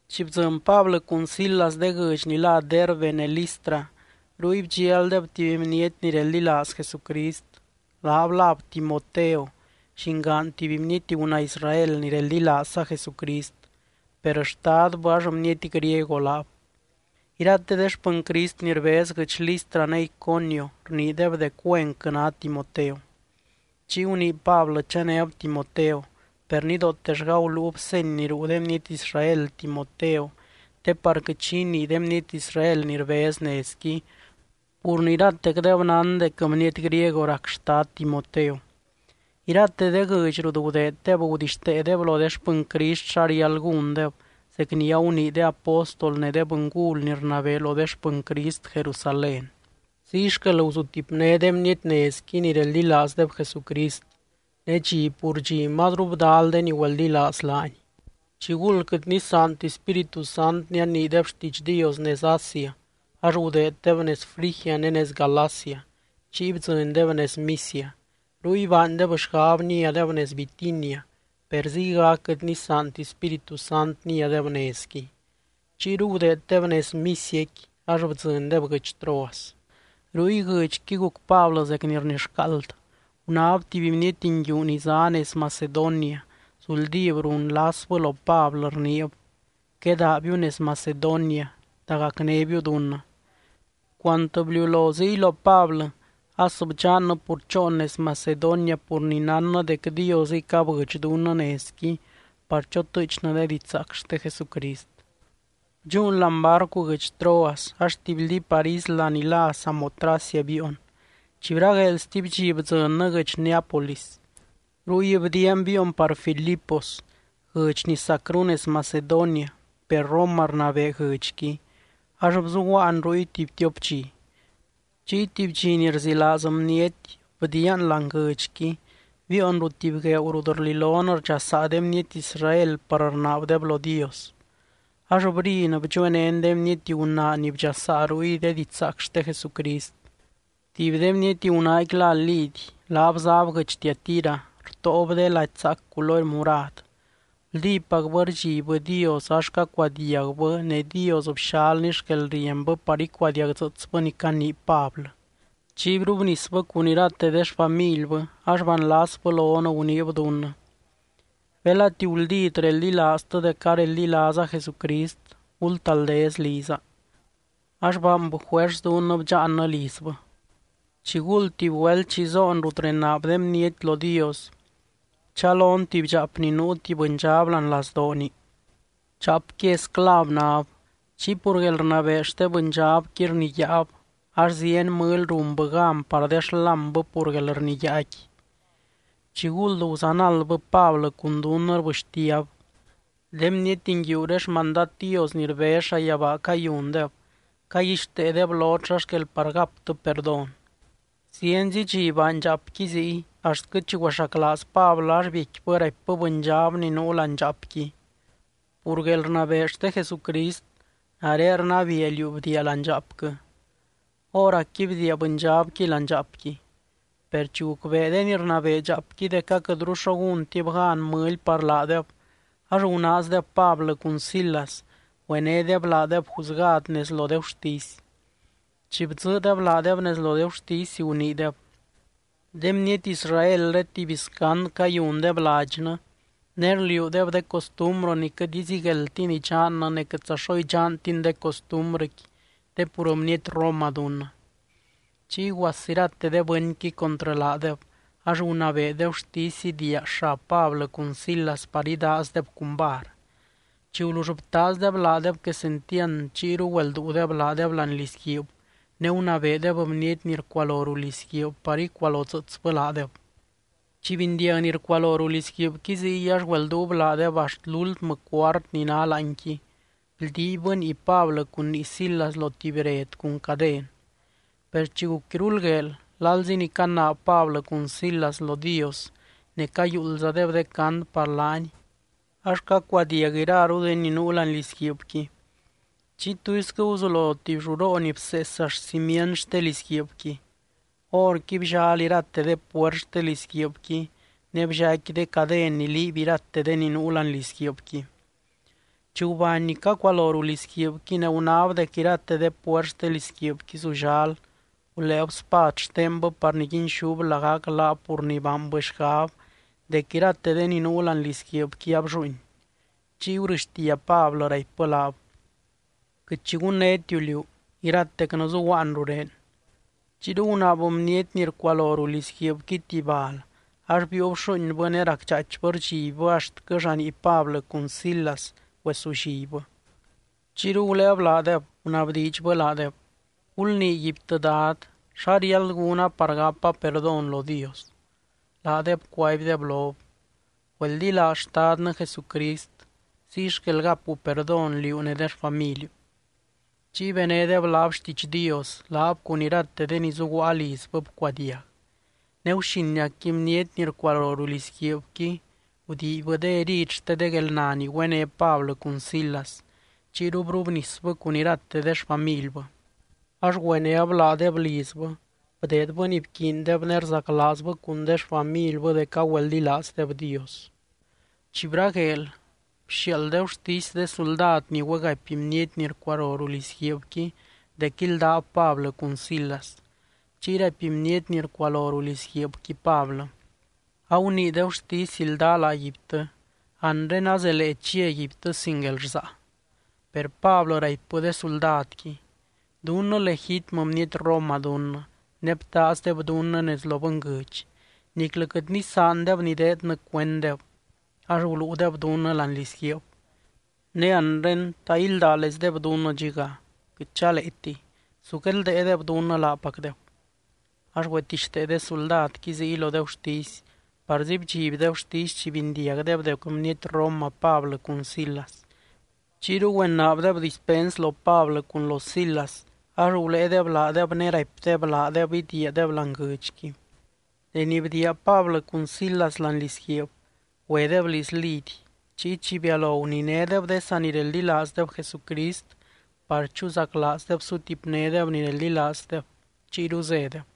Chi bdzɨny Pablɨ cun Silas de guɨdx ni lá Derbe ne Listra, ruy bdxialdeb tuby bniety ni reldilaaz Jesucrist. Laab láb Timoteo llingaan tuby bniety gunaa Israel ni reldilaazza Jesucrist, per xtadbɨ ax bniety griego laab. Irate de xpɨny Crist ni rbez guɨdx Listra ne Iconio rniideb dec güenquɨ ná Timoteo. Chiy gunii Pablɨ chanéb Timoteo, per nidootellga guluub seny ni ruu de bniety Israel Timoteo te par quɨt xi inii de bniety Israel ni rbez nezqui, pur ni iratecdeb nán dec bniety griego rac xtad Timoteo. Irate de guɨdx rut gudeeddeb gudixteedeb lo de xpɨny Crist xa riáld gúndeb, zec ni agunii de apóstol ne de bɨngul ni rnabee lo de xpɨny Crist Jerusalén. Ziy xquel guzutipné de bniety nezqui ni reldilaazdeb Jesucrist, ne dxi pur dxi mazru bdal de ni güeldilaaz laany. Chiguld quɨt nisaanti Spíritu Sant nianiideb xtiidx Dios nez Asia ax gudeeddeb nez Frigia ne nez Galacia, chiy bdzɨndeb nez Misia. Ruy baandeb xgab niadeb nez Bitinia, per ziygac quɨt nisaanti Spíritu Sant niadeb nezqui. Chiyru gudeeddeb nez Misiaqui, ax bdzɨndeb guɨdx Troas. Ruy, guxinqui guc Pablɨ zec ni rnixcaald. Gunáb tuby bniety nguiu ni zá nez Macedonia, zuldíb runlasbɨ lo Pablɨ, rniib: “Quedaabiu nez Macedonia, dagacnébiu dunnɨ.” Cuant bliulo ziy lo Pablɨ, as bdxannɨ pur choon nez Macedonia pur ni nánnɨ dec Diosɨy cabɨdx dunnɨ nezqui par chotɨɨchnɨ de didxzaac xte Jesucrist. Bdxúun láani barcu guɨdx Troas ax tibyldí par isla ni lá Samotracia biion. Chi bragueel stuby dxi bdzɨnnɨ guɨdx Neápolis. Ruy bdiian biion par Filipos, guɨdx ni sacru nez Macedonia, per Roma rnabee guɨdxqui, ax bzuguaan ruy tuby tiop dxi. Chiy tuby dxi ni rzilaaz bniety bdiian láani guɨdxqui, biion ruu tuby gueeu rut rlilon rdxasaa de bniety Israel par rnaabdeb lo Dios. Ax brin, bdxuenén de bniety gunaa ni bdxasaa ruy de didxzaac xte Jesucrist. Tuby de bniety gunaaqui lá Lidy, laab záb guɨdx Tiatira, rtóob de lady zaac culory murad. Guldípacbɨ rdxibbɨ Dios, ax cacuadiagbɨ, ne Dios bxalny xquelrienbɨ par icuadiagdzɨɨtsbɨ ni canii Pablɨ. Chiy brubnisbɨ cun irate de xfamilbɨ, ax banlasbɨ lon, guniib dunnɨ: —Belati guldít reldilaaztɨ dec areldilaaza Jesucrist, gultaldez liza. Ax baanbɨ juers dunnɨ bdxaannɨ lizbɨ. Chiguld tuby güelt chi zoon rut renaab de bniety lo Dios, bchalon tuby dxaap ni nuu tuby bɨndxab láani lazdooni. Dxaapqui esclav náb. Chiy pur guelrnabee xte bɨndxabqui rniyáab, ax zieny mɨly runbɨ gan par de xlámbɨ pur guelrniyáaqui. Chiguld guzanaldbɨ Pablɨ cun dunnɨ, rbɨxtiab: —De bniety nguiuré xmandad Dios ni rbez llayabaa cayundeb, caguixteedeb lot xa xquel par gaptɨ perdón. Zienzi dxi baany dxaapqui ziy, axtquɨ chi güexaclaaz Pablɨ ax biecquibɨ raipbɨ bɨndxab ni nuu láani dxaapqui: —Pur guelrnabee xte Jesucrist, nare rnabiia liú bdiia láani dxaapquɨ. Hóracqui bdiia bɨndxabqui láani dxaapqui. Per chi gucbee de ni rnabee dxaapqui dec aquɨtru xo gúntib gan mɨly par laadeb, ax gunaazdeb Pablɨ cun Silas, güenédeb laadeb juzgad nez lo de gurtisy. Chi bdzɨɨdeb laadeb nez lo de gurtisy, guniideb: —De bniety Israelré tuby scand cayundeb ladxnɨ, ne rliuudeb de costumbrɨ ni quɨt izigueldtin idxannɨ ne quɨtza xo idxantin de costumbrɨqui te pur bniety roma dunnɨ. Chiy guas irate de bɨnqui contrɨ laadeb, ax gunabee de gurtisy idiia xab Pablɨ cun Silas par idaazdeb cun var. Chi gulull btaazdeb laadeb quesentiand, chiyru güelduudeb laadeb láani lizguiib ne gunabeedeb bniety ni rcualo ruu lizguiib par icualodzɨɨtsbɨ laadeb. Chi bindiag ni rcualo ruu lizguiibqui ziy, ax güelduub laadeb axt lúltmɨ cuart ni ná láanqui, bldiibbɨ nii Pablɨ cun nii Silas lo tuby bred cun caden. Per chi guc iruld gueel, lalzi ni canaab Pablɨ cun Silas lo Dios ne cayuuldzadeb de cant par laany, ax cacuadiag iraru de ni nuu láani lizguiibqui. Chiy tuisquɨ guzulo tuby lluroo ni bsees axt cimient xte lizguiibqui. Horqui bllal irate de puert xte lizguiibqui, ne bllaicqui de caden ni liiby irate de ni nuu láani lizguiibqui. Chi gubany ni cacualo ruu lizguiibqui ne gunáb dec irate de puert xte lizguiibqui zullal, guléeb spad xtenbɨ par niguinxúb lagac laab pur ni baanbɨ xgab dec irate de ni nuu láani lizguiibqui ablluuin. Chiy gurɨxtia Pablɨ, raipbɨ laab: —Quɨt xi gunnétiu liú. Iratecnɨ zuguaan rurén. Chiyru gunaab bniety ni rcualo ruu lizguiibqui tuby bal, ax biiub xuuinbɨ ne racdxaaichbɨ rdxibbɨ axtquɨ llanii Pablɨ cun Silas güesullibbɨ. Chiyru guléeb laadeb, gunabdiidxbɨ laadeb: —Gulniiguibtɨ dad, ¿xa riáld gúna par gapa perdón lo Dios? Laadeb cuaibdeb lob: —Güeldilaaz Xtadnɨ Jesucrist, ziy xquel gapu perdón, liú ne de xfamiliu. Chiy benédeb laab xtiidx Dios, laab cun irate de ni zuguaa lizbɨ bcuadiag. Ne guxiniacqui, bniety ni rcualo ruu lizguiibqui gudiibybɨ de herid xte de guelna ni güené Pablɨ cun Silas. Chiyru brubnisbɨ cun irate de xfamilbɨ. Ax güenéb laadeb lizbɨ, bdeedbɨ ni bquiindeb, ne rzaclaazbɨ cun de xfamilbɨ dec agüeldilaazdeb Dios. Chi bragueel, bxiaald de gurtisy de suldad ni güegapy bniety ni rcualo ruu lizguiibqui dec íldab Pablɨ cun Silas. Chiy raipy bniety ni rcualo ruu lizguiib Pablɨ: —Agunii de gurtisy ildaa laaguibtɨ. Anre azelee chiaguibtɨ sin guelrsaa. Per Pablɨ raipbɨ de suldadqui: —Dunnɨ legítmɨ bniety Roma dunnɨ, ne btaazdeb dunnɨ nez lo bɨnguɨdx. Niclɨ quɨt nisaandeb nideednɨ cuenddeb, ax guluudeb dunnɨ láani lizguiib. Ne anre, ¿ta ildáleizdeb dunnɨ dxiga? ¡Quɨt chaleetiy! Su guedldéedeb dunnɨ laapacdeb. Ax güetixtee de suldadqui ziy lo de gurtisy, parzi bdxiby de gurtisy chi bindiag dec bniety Roma Pablɨ cun Silas. Chiyru güenaabdeb dispens lo Pablɨ cun lo Silas, ax guléedeb laadeb ne raipdeb laadeb idiiadeb láani guɨdxqui. Deni bdiia Pablɨ cun Silas láani lizguiib, güedeb liz Lidy. Chiy chi bialo guninédeb de sanireldilaazdeb Jesucrist par chuzaclaazdeb sutipnédeb ni reldilaazdeb, chiyru zédeb.